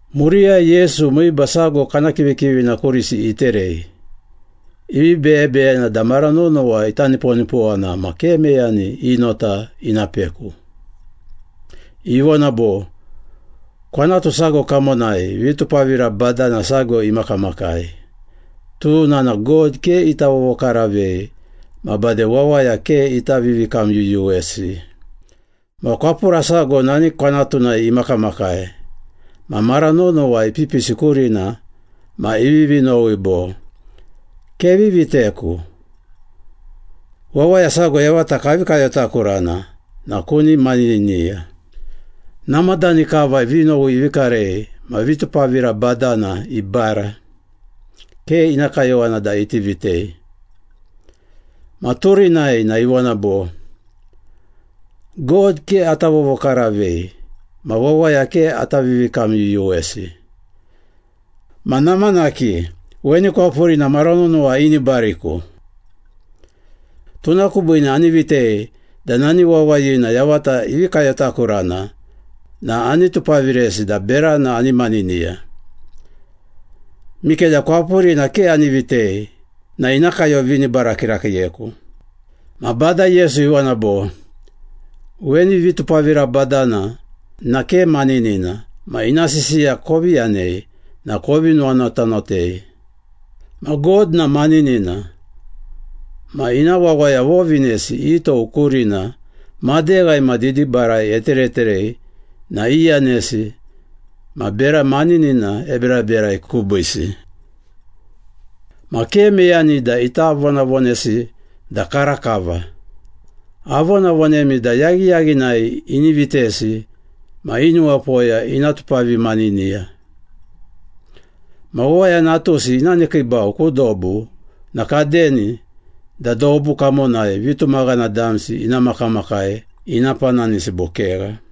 Muriyai Yesu miiba sago kana kivikivina kurisi iterei, ivi beyebeyena da mara nonowa ita niponipowana ma ke meyani i nota ina peku. Ivona bo, “Kwanatu sago kamonai vitupavira badana sago imakamakai, tuna na God ke ita vovokaravei ma bade wawaya ke ita vivikamyuyuwesi. Ma kwapura sago nani kwanatunai imakamakai ma mara nonowa ipipisi kurina ma ivivi nowi bo, ‘Kevi viteku. Wawaya sago yavata kavi kayotakurana na kuni maniniya.’ Namadani kava vinowi ivi karei ma vitupavira badana ibara, ke ina kayowana da iti vitei. Ma turinai na ivona bo, ‘God ke ata vovokaravei ma wawaya ke ata vivikamyuyuwesi, ma namanaki, weni kwapurina mara nonowa inibariku. Tuna kubiine ani vitei da nani wawayina yavata ivi kayotakurana na ani tupaviresi da berana ani maniniya. Mikeda kwapurina ke ani vitei na ina kayovinibara kirakiiyeku!’” Ma Bada Yesu ivona bo, “Weni vitupavira badana na ke maninina ma ina sisiya kovi yanei na kovi nuwanotanotei. Ma God na maninina, ma ina wawaya vovinesi i tou kurina madeghai ma didibarai etereterei na iyanesi ma bera maninina eberaberai kubiisi. Ma ke meyani da ita vonavonesi da karakava. Avonavonemi da yaghiyaghinai ini vitesi ma i nuwapoya ina tupavimaniniya. Ma Wawaya Natusi ina nekiibau ku dobu na kadeni da dobu kamonai vitumaghana damsi ina makamakai ina pananisi bo kegha?”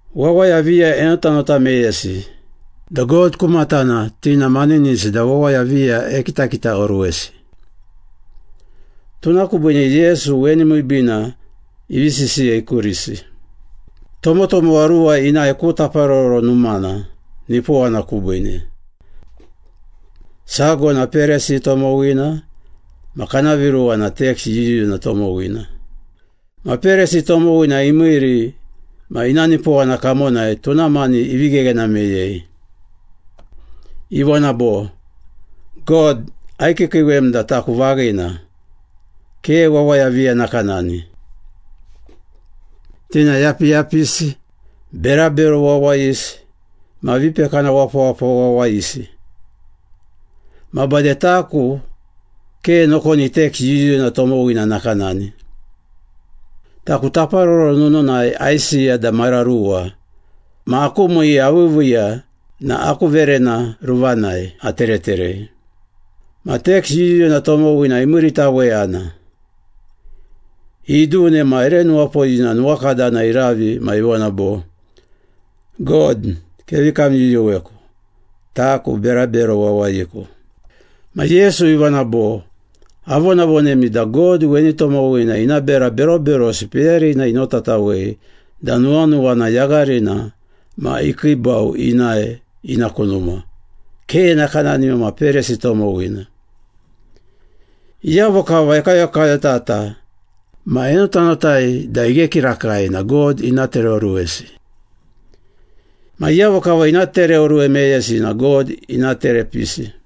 Wawaya viya enotanota meyesi, da God ku matana ti na maninisi da wawaya viya ekitakitaoruwesi. Tuna kubiine Yesu weni miibiina ivi sisiyei kurisi. “Tomotomowa ruwa inae ku Taparoro Numana, nipowana kubiine. Sago na Perisi tomowina ma kana viruwa na teks yuyuna tomowina. Ma Perisi tomowina imiiri ma ina nipowana kamonai tuna mani ivi gheghena meyei. Ivona bo, ‘God aikiikiiwem da taku vaghina, ke wawaya viya nakanani. Ti na yapiyapisi, berabero wawayisi ma vipekana wapawapa wawayisi. Ma bade taku ke nokoni teks yuyuna tomowina nakanani. Taku taparoro nununai aisiya da mara ruwa ma aku miiya aviiviiya na aku verena ruvanai atereterei.’ Ma teks yuyuna tomowina imiiritaweyana. Idune ma ere nuwapoyina nuwakadana iravi ma ivona bo, ‘God, kevi kamyuyuweku, taku berabero wawayiku.’” Ma Yesu ivona bo, “Avonavonemi da God weni tomowina ina bera beroberosi peyarina inotatawei da nuwanuwana yagharina ma ikiibau inae ina ku numa, ke nakanani ma Perisi tomowina. Iyavo kava ekayokayotata ma enotanotai da ighe kirakai na God ina tereoruwesi. Ma iyavo kava ina tereoruwe meyesi na God ina terepisi.”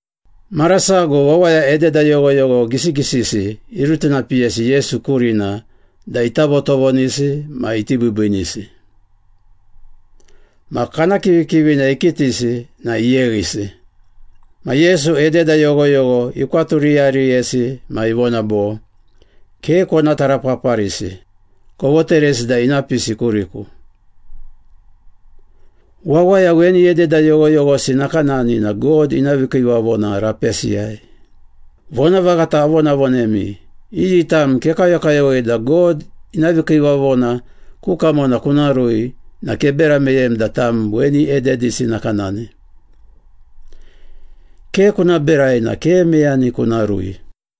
Mara sago wawaya ededa yoghoyogho gisigisisi irutinapiyesi Yesu kurina da ita votovonisi ma iti biibiinisi. Ma kana kivikivina ikitisi na iyeghisi. Ma Yesu ededa yoghoyogho ikwaturiyariyesi ma ivona bo, “Ke kona tarapaparisi, kovoteresi da ina pisi kuriku. Wawaya weni ededa yoghoyoghosi nakanani na God ina vikiivavona rapesiyai. Vonavaghata avonavonemi, iyi tam kekayokayowei da God ina vikiivavona ku kamona kuna rui na kebera meyem da tam weni ededisi nakanani. Ke kuna berai na ke meyani kuna rui.”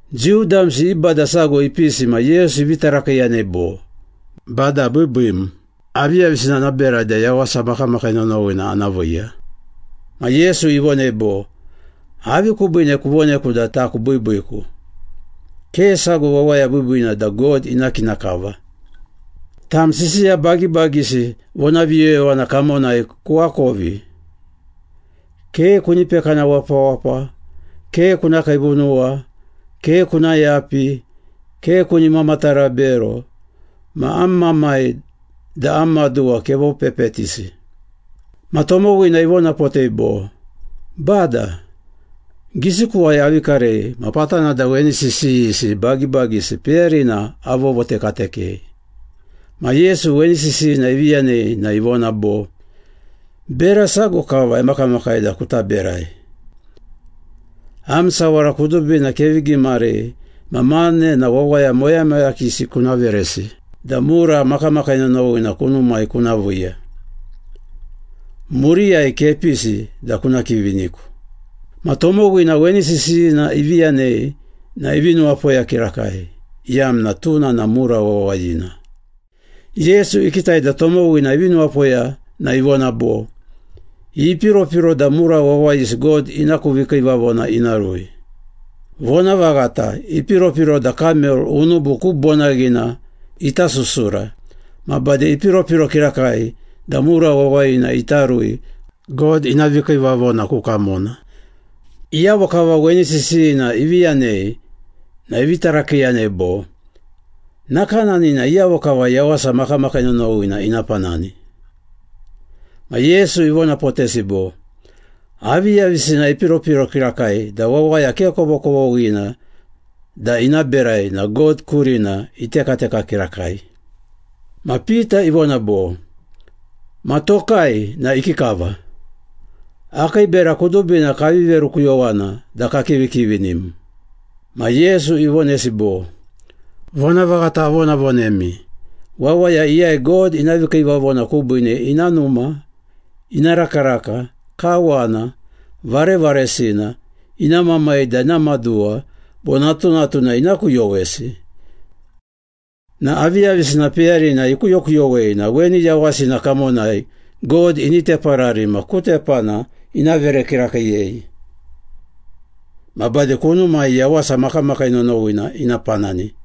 Jiu damsi i bada sago ipisi ma Yesu ivi tarakiiyanei bo, “Bada biibiim, aviyavisina ana berai da yawasa makamakii nonowina ana viiya?” Ma Yesu ivonei bo, “Avi kubiine kuvoneku da taku biibiiku? Ke sago wawaya biibiina da God ina kina kava. Tam sisiya bagibagisi vonaviyoyovana kamonai kuakovi. ‘Ke kuni pekana wapawapa, ke kuna kiivunuwa, ke kuna yapi, ke kuni mamatara bero, ma am mamai da am maduwa kevopepetisi.’” Ma tomowina ivonapotei bo, “Bada, gisikuwai avi karei ma patana da weni sisiyisi bagibagisi peyarina avovotekatekei.” Ma Yesu weni sisiyina ivi yanei na ivona bo, “Bera sago kava emakamakai da kuta berai. Am sawara kudubina kevi gimarei ma mane na wawaya moyamoyakisi kuna veresi da mura makamakii nonowina kunumai kuna viiya. Muriyai kepisi da kuna kiviniku.” Ma tomowina weni sisiyina ivi yanei na ivi nuwapoya kirakai, iyamna tuna na mura wawayina. Yesu ikitai da tomowina ivi nuwapoya na ivona bo, “Ipiropiro da mura wawayisi God ina ku vikiivavona ina rui. Vonavaghata, ipiropiro da kamel unubu ku bonaghina ita susura ma bade ipiropiro kirakai da mura wawayina ita rui God ina vikiivavona ku kamona.” Iyavo kava weni sisiyina ivi yanei na ivi tarakiiyanei bo, “Nakanani na iyavo kava yawasa makamakii nonowina ina panani?” Ma Yesu ivonapotesi bo, “Aviyavisina ipiropiro kirakai da wawaya ke kovokovoghina da ina berai na God kurina itekateka kirakai.” Ma Pita ivona bo, “Ma tokai, na ikikava? Akii bera kudubina kavi verukuyowana da kakivikivinim.” Ma Yesu ivonesi bo, “Vonavaghata avonavonemi, wawaya iyai God ina vikiivavona kubiine ina numa, ina rakaraka, kawana, varevaresina, ina mamai da ina maduwa bo natunatuna ina kuyowesi na aviyavisina peyarina ikuyokuyowei na weni yawasina kamonai God ini teparari ma ku tepana ina vere kirakiiyei. Ma bade kunumai yawasa makamakii nonowina ina panani.”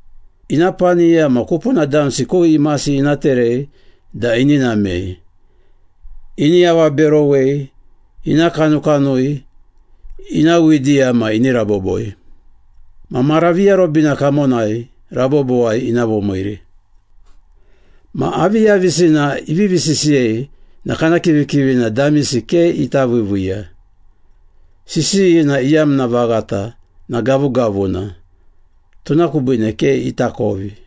Ina paniya ma kupuna damsi ku imasi ina terei da ini namei, ini avaberowei, ina kanukanui, ina widiya ma ini raboboi. Ma mara viarobina kamonai rabobowai ina vomiiri.” Ma aviyavisina ivivi sisiyei na kana kivikivina damisi ke ita viiviiya. Sisiyina iyamna vaghata na gavugavuna, tuna kubiine ke itakovi.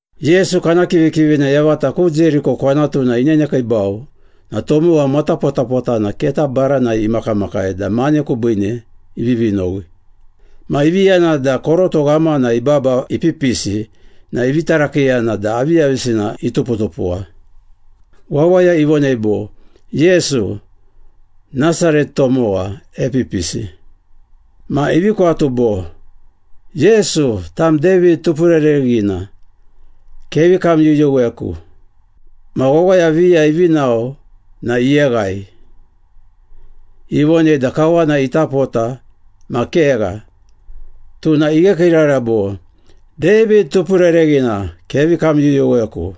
Yesu kana kivikivina yavata ku Jeriko kwanatuna inenekiibau na tomowa matapotapotana keta baranai imakamakai da mane kubiine ivivi nowi. Ma ivi yana da koroto ghamana ibaba ipipisi na ivi tarakiiyana da aviyavisina ituputupuwa. Wawaya ivonei bo, “Yesu, Nasaret tomowa, epipisi.” Ma ivi kwatu bo, “Yesu, tam David Tupurereghina, kevi kamyuyuweku!” Ma wawaya viya ivi nao na iyeghai. Ivonei da kawana ita pota ma kegha, tuna ighekiirara bo, “David Tupurereghina, kevi kamyuyuweku!”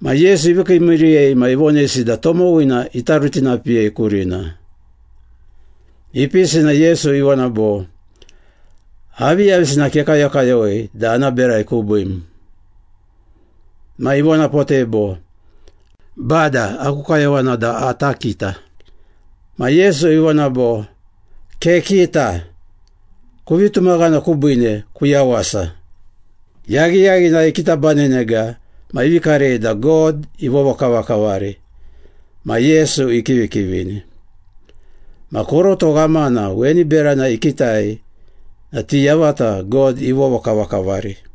Ma Yesu ivi kiimiiriyei ma ivonesi da tomowina ita rutinapiyei kurina. Ipisi na Yesu ivona bo, “Aviyavisina kekayokayowei da ana berai kubiim?” Ma ivonapotei bo, “Bada, aku kayowana da ata kita.” Ma Yesu ivona bo, “Kekita. Kuvi tumaghana kubiine kuyawasa.” Yaghiyaghinai ikitabanenega ma ivi karei da God ivovokavakavari ma Yesu ikivikivini. Ma koroto ghamana weni berana ikitai na ti yavata God ivovokavakavari.